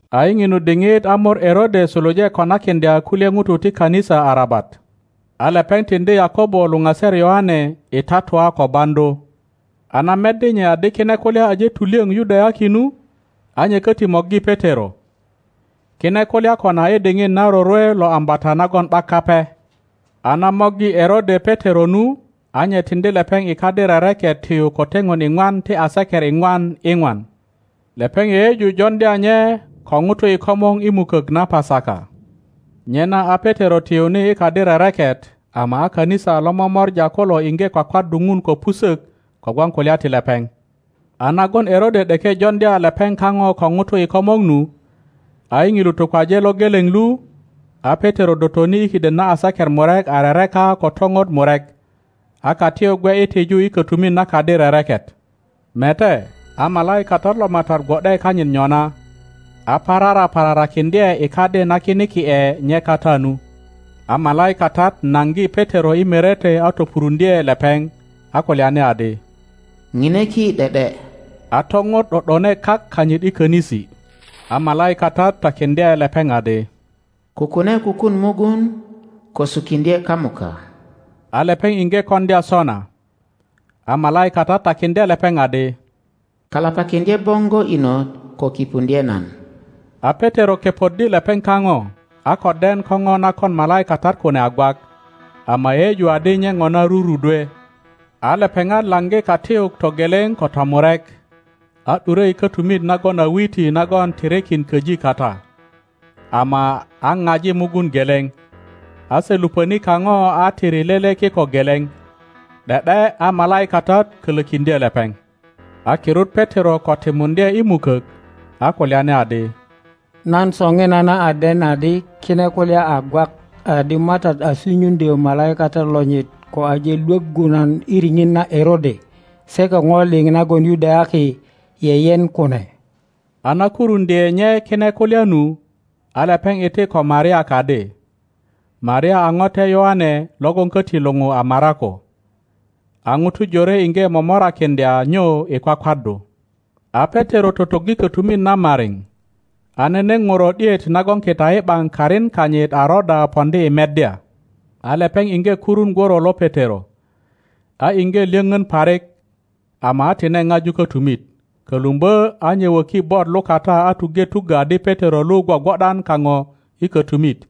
A i ŋinu diŋit a mor Erode suluje konakiŋdya kulye ŋutu ti kanisa arabat. A lepeŋ tiŋdi Yakobo luŋaser Yoane i tatua ko baŋdu. A na meddi nye adi kine kulya aje tulyöŋ Yudayaki nu, a nye köti morgi Petero. Kine kulya kona i diŋit na rorwe lo Ambata nagon ’bak Kape. A na morgi Erode Petero nu, a nye tiŋdi lepeŋ i kadi rereket tiyu ko teŋon iŋwan ti aseker iŋwan iŋwan. Lepeŋ yeyeju joŋdya nye ko ŋutu i komor i mukök na Pasaka. Nyena a Petero tiyuni i kadi rereket, ama a kanisa lo momora kulo iŋge kwakwaddu Ŋun ko pusök kogwon kulya ti lepeŋ. A nagon Erode ’deke joŋdya lepeŋ kaŋo ko ŋutu i komor nu, a i ŋilu tukwaje lo geleŋ lu, a Petero dotoni i kiden na aseker murek a rereka ko topot murek, a katiyuk gwe i tiju i kötumit na kadi rereket. Mete, a malaikatat lo Matat gwo ’de kanyit nyona, a parara pararakiŋdye i kadi na kiniki ’e nye kata nu. A malaikatat naŋgi Petero i merete a topuruŋdye lepeŋ, a kulyani adi, ŋine ki ’de ’de. A topot ’do ’done kak kanyit i könisi. A malaikatat takiŋdye lepeŋ adi, Kukune kukuŋ mugun, ko sukiŋdye kamuka. A lepeŋ iŋge koŋdya sona. A malaikatat takiŋdye lepeŋ adi, Kalapakiŋdye boŋgo inot ko kipuŋdye nan. A Petero kepoddi lepeŋ kaŋo, a ko den ko po na kon malaikatat kune a gwak, ama yeyeju adi nye ŋona rurudwe. A lepeŋat laŋgi katiyuk togeleŋ ko tomurek, a ’dure i kötumit nagon a witi nagon tirikin köji kata, ama a paji mugun geleŋ, a se luŋöni kaŋo a tiri lele kiko geleŋ; ’de ’de a malaikatat kölökiŋdye lepeŋ. A kirut Petero ko timuŋdye i mukok, a kulyani adi, Nan soŋinana a den adi kine kulya a gwak adi Matat a sunyuŋdyö malaikatat lonyit ko aje Iwoggu nan i riŋit na Erode se ko po liŋ nagon Yudayaki yeyen kune. A na kuruŋdye nye kine kulya nu, a lepeŋ iti ko Maria kadi. (Maria a ŋote Yoane logon köti luŋu a Marako.) A ŋutu jore iŋge momorakiŋdya nyu i kwakwaddu. A Petero totoggi kötumit na mariŋ, a nene ŋuro ’diet nagon kita i ’baŋ karin kanyit a Roda poŋdi i meddya. A lepeŋ iŋge kurun gworo lo Petero, a iŋge lyöpön parik, ama a tine paju kötumit, kölumbö a nye wöki bot lukata a tuŋge tuggö adi Petero lu gwogwo ’dan kaŋo i kötumit.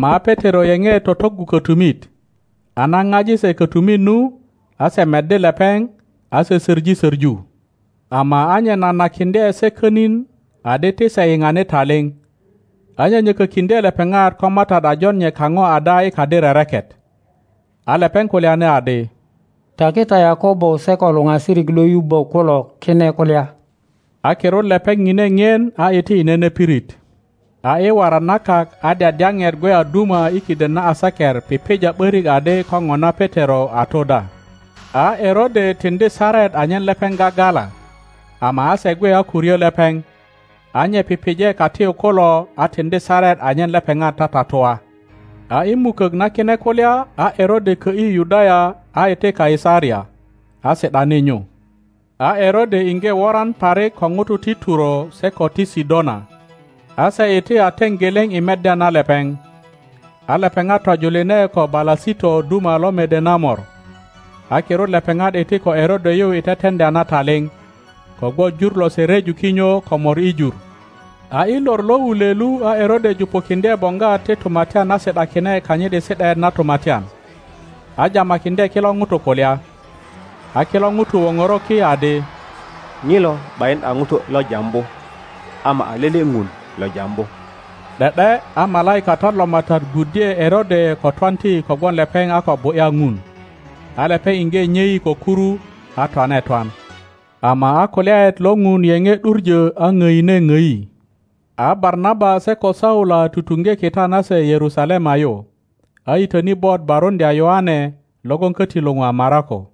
Ama a Petero yeŋe totoggu kötumit, a na paji se kötumit nu, a se meddi lepeŋ, a se söŋi söŋu. Ama a nye nanakiŋdye se könin adi ti se yiŋani taliŋ, a nyönyökökiŋdye lepeŋat ko Matat a jon nye kaŋo ada i kadi rereket. A lepeŋ kulyani adi, Taki ta Yakobo se ko luŋasirik lo yubbö kulo kine kulya. A kirut lepeŋ pine ŋien a iti i nene pirit. A i waran na kak a dyadyapet gwe a duma i kiden na aseker pipija ’börik adi ko ŋona Petero a tu da. A Erode tiŋdi saret anyen lepeŋ gagala, ama a se gwe a ko ryö lepeŋ, a nye pipije katiyuk kulo a tiŋdi saret anyen lepeŋat tatatua. A i mukök na kine kulya a Erode kö ’yi Yudaya a iti Kaisaria, a si ’dani nyu. A Erode iŋge woran parik ko ŋutu ti Turo se ko ti Sidona. A se iti a teŋ geleŋ i meddya na lepeŋ. A lepeŋat tojuline ko Balasito duma lo mede na mor, a kirut lepeŋat iti ko Erode yu i teteŋdya na taliŋ, kogwon jur lose ryeju kinyo ko mor i jur. A i lor lo wulwe lu a Erode jupukiŋdye boŋgwat ti tumatyan a si ’dakine kanyit i si ’daet na tumatyan, a jamakiŋdye kilo ŋutu kulya. A kilo ŋutu woŋoro ki adi, Ŋilo ’bayin a ŋuto lo jambu, ama a lele ŋun lo jambu. ’De ’de a malaikatat lo Matat gwuddye Erode ko twanti kogwon lepeŋ a ko bu ’ya Ŋun. A lepeŋ iŋge nyei ko kuru, a twane twan. Ama a kulyaet lo Ŋun yeŋe ’duŋö a ŋdine ŋdi. A Barnaba se ko Saula tutuŋge kita nase Yerusalema yu, a yitöni bot baruŋdya Yoane logon köti luŋu a Marako.